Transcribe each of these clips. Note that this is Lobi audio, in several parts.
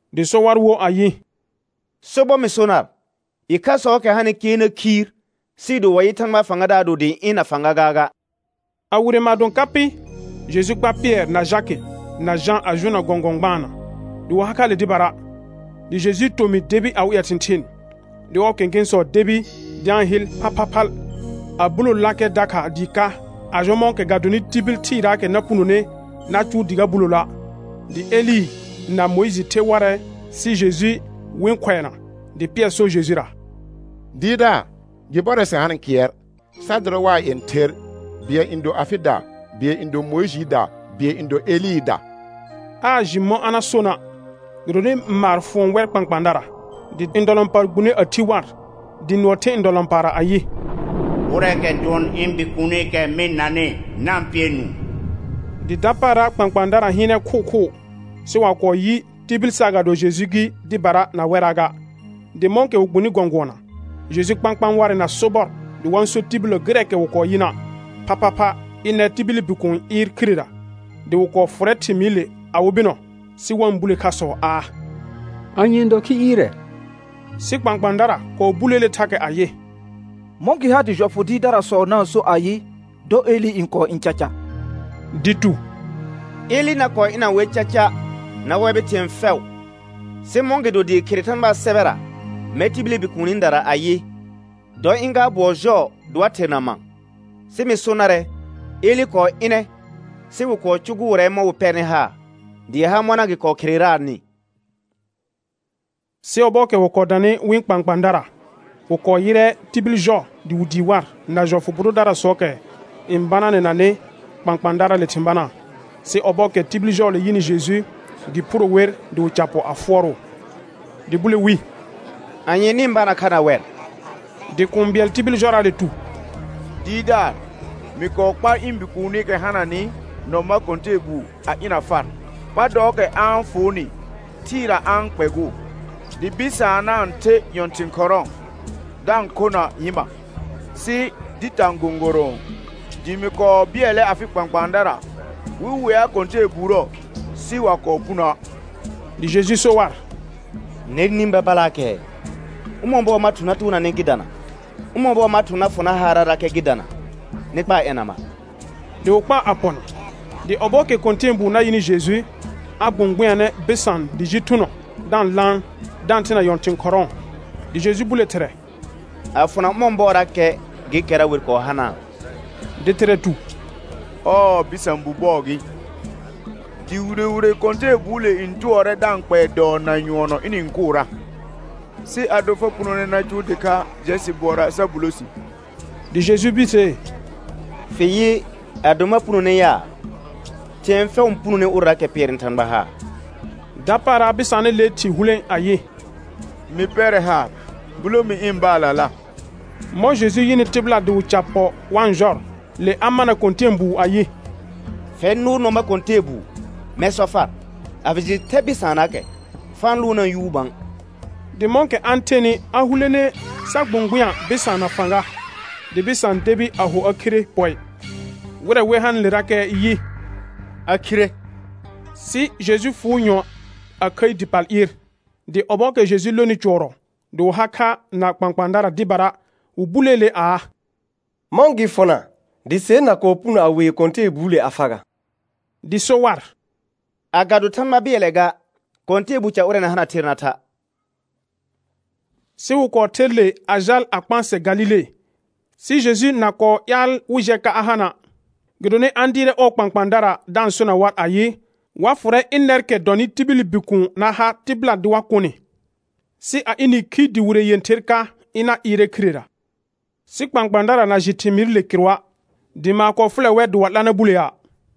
Dɩ so war wo ayɩ: Sobɔr mɩ so nar, ɩkhasɔɔkɛ hanɩ kɩɛr na khiir sɩɩ do wa yɩ Thãgbaa fãgadaar do dɩɩ ɩ̃ na fãga gaaga. A wire maadõ ka pɩ, Jeju kpar Pɩɛr na Jakɩ na Jã a jʋʋnna gɔ̃gɔ̃ gbaana, dɩ wɩ ha kha le dɩbara; dɩ Jejuu tomɩ debi awɩ ƴɛ thɩ̃thɩɩn. Dɩ ɔɔ kẽkẽsɔ debi dɩ a-n hɩl phalphalphal, a bulololakɛ dakha dɩɩ ka, a jɔ mɔ̃kɛ ga donɩ tibil thɩɩraakɛ na punone na cʋʋ dɩ a buloloa'. Dɩ Elɩ na Mʋɩjɩ the warɛ sɩ Jeju wɩ-n khʋɛna. Dɩ Pɩɛr so Jejura: Dɩɩrdaar, gɩ bɔrɛ sɩ hanɩ kɩɛr; sa dʋrɛ waa yẽther, bɩɛl n do afɩda, bɩɛl n do Mʋɩjɩɩda, bɩɛl n do Elɩɩda. Aa jɩ mɔ̃ a na sona', gɩdonɩ maar fʋɔn wɛr kpãkpãadara. Dɩ ndɔlɔ̃paar gbune a thi war, dɩ nʋɔ the ndɔlɔ̃paarra ayɩ: Ʋrɛɛkɛ dʋɔn ɩ̃ Bikuunikɛ mɩ-n nanɩ, na-n pɩɛ nũu. Dɩ dapaara kpãkpãadara hɩɩnɛ khʋʋkhʋʋ, sɩ wa kɔɔ yɩ tibil saagado Jeju gɩ dɩbara na wɛraa ga. Dɩ mɔ̃kɛ wɩ gbuni gɔ̃gʋɔna, Jeju kpãkpãa warɛ na sobɔr dɩ wa-n so tibillə gɩrɛɛkɛ wɩ kɔɔ yɩna', phaphapha ɩnɛr tibili Bikuun n ɩɩr khirera. Dɩ wɩ kɔɔ fʋrɛ thɩmɩɩrɩle awɩ bɩnɔ, sɩ wa-n bule khasɔ aa: Anye n dɔ khi ɩɩrɛ? Sɩ kpãkpãadara kɔɔ buleele thakɛ ayɩ: Mɔ̃ gɩ ha dɩ jɔfʋ dɩɩrdarasɔ na-n so ayɩ: Dɔ Elɩ n kɔɔ ɩ̃ caca. Dɩ tu: Elɩ na kɔɔ ɩna wer eaca na wɛbɩ thɩ̃ɛ fɛʋ. Sɩ mɔ̃gɩdo dɩɩ khere Thãgbaa sɛbɛra mɛr tibili Bikuunidara ayɩ: Dɔ ɩ̃ gaar bʋɔ jɔɔ dɩ wa therna ma? Sɩ mɩ so narɛ, Elɩ kɔɔ ɩnɛ sɩ wɩ kɔɔ cʋgʋʋrɛ mɔ̃ wɩ pɛrnɩ haar, dɩɩ ha mɔna gɩ kɔɔ khereraanɩ. Sɩ ɔbɔɔkɛ wɩ kɔɔ danɩ wɩ̃ kpãkpãadara, wɩ kɔɔ yɩrɛ tibil jɔ dɩ wɩ dii war na jɔfʋ dɩɩrdarasɔɔkɛ n bananɛnanɩ kpãkpãadaraale thɩ̃ banaa. Sɩ ɔbɔɔkɛ tibil jɔɔle yɩnɩ Jeju, gɩ phuro wer dɩ wɩ ca pɔ a fʋɔrʋʋ. Dɩ bule wi: Anye nɩ-n bana kha na wɛr? Dɩ kũu bɩɛl tibil jɔraale tu: Dɩɩrdaar, mɩ kɔɔ kpar ɩ̃ bikuunikɛ hananɩ nɔ ma kɔ̃tɛɛbuu a ɩna far; pa dɔɔkɛ a-n fʋʋnɩ thɩɩra a-n kpɛgʋʋ, dɩ bɩsaan na-n the nyɔ̃thɩ̃ khɔrɔ̃ɔ, da-n khona nyɩma, sɩ dɩ tã gõgorõo; dɩ mɩ kɔɔ bɩɛlɛ afɩ kpãkpãadara wɩ wea kɔ̃tɛɛbuurə, sɩ wa kɔɔ punoə'. Dɩ Jeju so war: Nɛr nĩ babalaakɛɛ; ʋmɔ̃ bɔɔ ma thʋ̃ na toona nɩ gɩ dana? Ʋmɔ̃ bɔɔ ma thʋ̃ na fʋ nar haarrarakɛ gɩ dana? Nɩ kpaa ɛna mar. Dɩ wɩ kpaa a pɔna; dɩ ɔbɔɔkɛ kɔ̃tɛɛbuu na yɩnɩ Jeju, a gbʋ̃gbʋnyanɛ bɩsaan dɩ ji thʋnɔ da-n laan, da-n thena nyɔ̃thɩ̃ khɔrɔ̃ɔ. Dɩ Jeju bule thɩrɛ: A fʋna ʋmɔ̃ bɔɔrakɛ gekɛra wer kɔɔ hanaa? Dɩ thɩrɛ tu: Ɔɔ bɩsã bu bɔɔ gɩ. Dɩ wire wire kɔ̃tɛɛbuule n tʋɔrɛ da-n kpɛɛ dɔɔ na nyʋɔnɔ ɩnɩ-n kʋʋra; sɩ ado fa punone na cʋʋ dɩkha, jɛ sɩ bʋɔra sa bulo si. Dɩ Jeju birsee: Fɩ yɩ, ado ma punone ya? Thɩ̃ɛ fɛʋ n punone ʋrɛraakɛ pɩɛrnɩ Thãgba haar. Dapaara bɩsaanɩlee thɩ hulẽ ayɩ: Mɩ pɛrɛ haar, bulo mi ɩ̃ baallala. Mɔ̃ Jeju yɩnɩ tɩbɩla dɩ wɩ ca pɔ wa-n jɔr, le a mana kɔ̃tɛɛbuu ayɩ: Fɛr nʋʋr nɔ ma kɔ̃tɛɛbuu, mɛr sɔ far: A fɩ jɩ thɛ bɩsaannaakɛ, fa-n lʋʋnaa yuu bã. Dɩ mɔ̃kɛ a-n thenɩ a hulene sa gbʋ̃gbʋnyã bɩsaan na fãga, dɩ bɩsaan debi a ho a khire pɔɩ; wɩrɛ wer hanɩlerakɛ yɩ: A khire. Sɩ Jeju fʋʋ nyɔ̃ɔ a khəi dɩ pal ɩɩr. Dɩ ɔbɔɔkɛ Jeju lonɩ cʋɔrɔ dɩ wɩ ha kha na kpãkpãadara dɩbara, wɩ buleele aa: Mɔ̃ gɩ fʋna dɩ ser na kɔɔ puno a wee kɔ̃tɛɛbuule a fa ga? Dɩ so war: Agado Thãgba bɩɛlɛ ga, kɔ̃tɛɛbu ca ʋrɛ na hana ther na tha'. Sɩ wɩ kɔɔ ther le a jal a kpãsɛ Galile, sɩ Jeju na kɔɔ ƴaal wɩ jɛ ka a hana'; gɩdonɩ a-n dɩɩrɛ ɔɔ kpãkpãadara, da-n sona war ayɩ, wa fʋrɛ ɩnɛrkɛ dɔnɩ tibili Bikuun na ha tɩbɩla dɩ wa kʋ nɩ, sɩ a ɩnɩ khi dɩ wire yẽther ka, ɩna ɩɩrɛ khirera. Sɩ kpãkpãadara na jɩ thɩmɩɩrɩle kɩrʋa', dɩ maar kɔɔ fʋlɛ wɛr dɩ wa 'la na bulea'.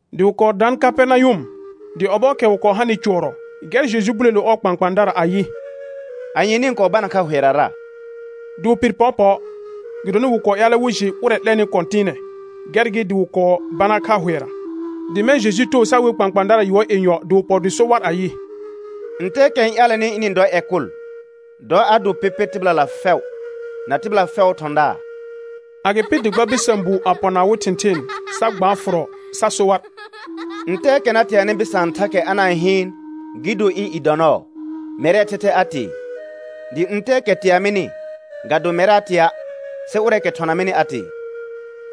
Dɩ wɩ kɔɔ daan Kapɛrnayʋm; dɩ ɔbɔɔkɛ wɩ kɔɔ hanɩ cʋɔrɔ, gɛr Jeju bulelo ɔɔ kpãkpãadara ayɩ: Anye nɩ-n kɔɔ bana kha hʋɛrara? Dɩ wɩ pɩr pɔɔpɔɔ, gɩdonɩ wɩ kɔɔ ƴaalɛ wɩ jɩ ʋrɛ 'lɛnɩ kɔ̃tɩɩnɛ, gɛr gɩ dɩ wɩ kɔɔ bana kha hʋɛra. Dɩ mɛ̃ Jeju too sa we kpãkpãadara yʋɔr yenyɔ, dɩ wɩ pɔ dɩ so war ayɩ: Ntɛɛkɛ n ƴaalɛnɩ ɩnɩ-n dɔ ƴɛ kʋl, dɔ a do pɩpɩr tɩbɩlala fɛʋ na tɩbɩla fɛʋʋ thɔ̃daar. Agɩpɩ dɩ kpa bɩsã buu a pɔna awɩ thɩ̃thɩɩn, sa gbaa fʋrɔ sa so war: Ntɛɛkɛ na teanɩ bɩsaan thakɛ a na-n hɩɩn, gɩ do ɩ̃ i dɔ nɔɔ, mɛrɛɛ thɛthɛ a tee. Dɩ ntɛɛkɛ tea mɩnɩ, ga do mɛr a tea', sɩ ʋrɛɛkɛ thɔna mɩnɩ a tee.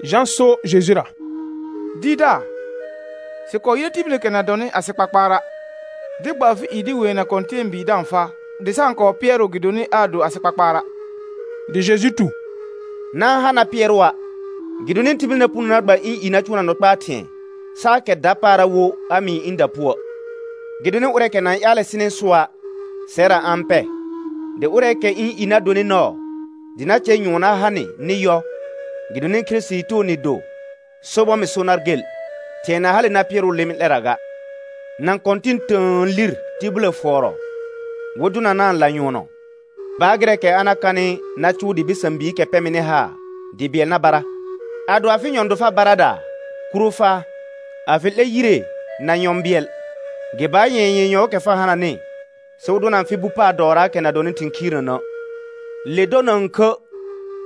Jã so Jejura: Dɩɩrdaar, sɩ kɔɔ yɩrɛ tibilikɛ na dɔnɩ asɩ kpakpaara', dɩ gba afɩ i dɩ weena kɔ̃tɛɛbii da-n faa, dɩ sa-n kɔɔ pɩɛrʋʋ gɩdonɩ aa do asɩ kpakpaara'. Dɩ Jeju tu: Na-n ha na pɩɛrʋa', gɩdonɩ tibil na puno na gba ɩ̃ i na cʋʋna nɔ kpaa thɩ̃ɛ, saa kɛr dapaara wo a mɩɩ ɩ̃da puə'. Gɩdonɩ ʋrɛɛkɛ na-n ƴaalɛ sɩnɩ sʋa', sɛrra a-n pɛ. Dɩ ʋrɛɛkɛ ɩ̃ i na donɩ nɔɔ dɩ na cɛ nyʋɔn na ha nɩ nɩ yɔ, gɩdonɩ Kirisitii too nɩ do, sobɔr mɩ so nar gel, thɩ̃ɛ na hale na pɩɛrʋʋ lɩmɩ 'lɛrra ga. Nã kɔ̃tɩ̃ tə̃ə lir tibillə fʋɔrɔ wɩ dʋnanaa lanyʋɔnɔ, baar gɩrɛɛkɛ a na kanɩ na cʋʋ dɩ bɩsã biikɛ pɛ mɩnɩ haar dɩ bɩɛl na bara. Ado afɩ nyɔ̃ do far baradaa, kuro faa. A fɩ 'lɛ yire na nyɔ̃ bɩɛl, gɩ baar nyɛ̃ɛ yenyɔɔkɛ fa hananɩ sɩ wɩ dʋna fɩ bu paar dɔɔraakɛ na dɔnɩ thɩ̃ khiirnənə'. [Le dɔ na-n khə',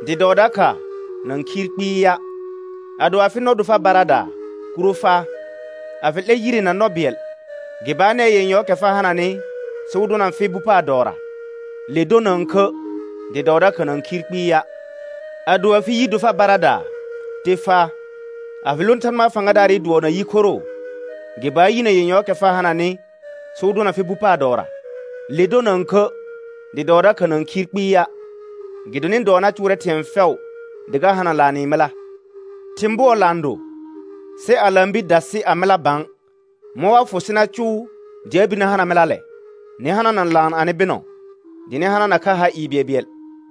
dɩ dɔɔ dakha na-n khiir kpɩɩa'.] Ado afɩ nɔ do far baradaa, kuro faa. A fɩ 'lɛ yire na nɔ bɩɛl, gɩ baar nɛɛ yenyɔɔkɛ fa hananɩ sɩ wɩ dʋna fɩ bu paar dɔɔra. [Le dɔ na-n khə', dɩ dɔɔ dakha na-n khiir kpɩɩa'.] Ado afɩ yi do far baradaa, te faa. A fɩ lõ Thãgba fãgadaarɩ dʋɔ na yi khoroo, gɩ baar yinə yenyɔɔkɛ fa hananɩ sɩ wɩ dʋna fɩ bu paar dɔɔra. Le dɔ na-n khə', dɩ dɔɔ dakha na-n khiir kpɩɩa'. Gɩdonɩ dɔɔ na cʋʋrɛ thɩ̃ɛ fɛʋ dɩ ga hana laanɩ mɩla. Thɩ̃ bʋɔ laan do, sɩ a laan bir dasɩ a mɩla bã, mɔ̃ wa fʋ sɩ na cʋʋ dɩ a bir na hana mɩlalɛ? Nɩ hanana laan anɩ bɩnɔ, dɩ nɩ hanana kha ha ɩɩ bɩɛlbɩɛl.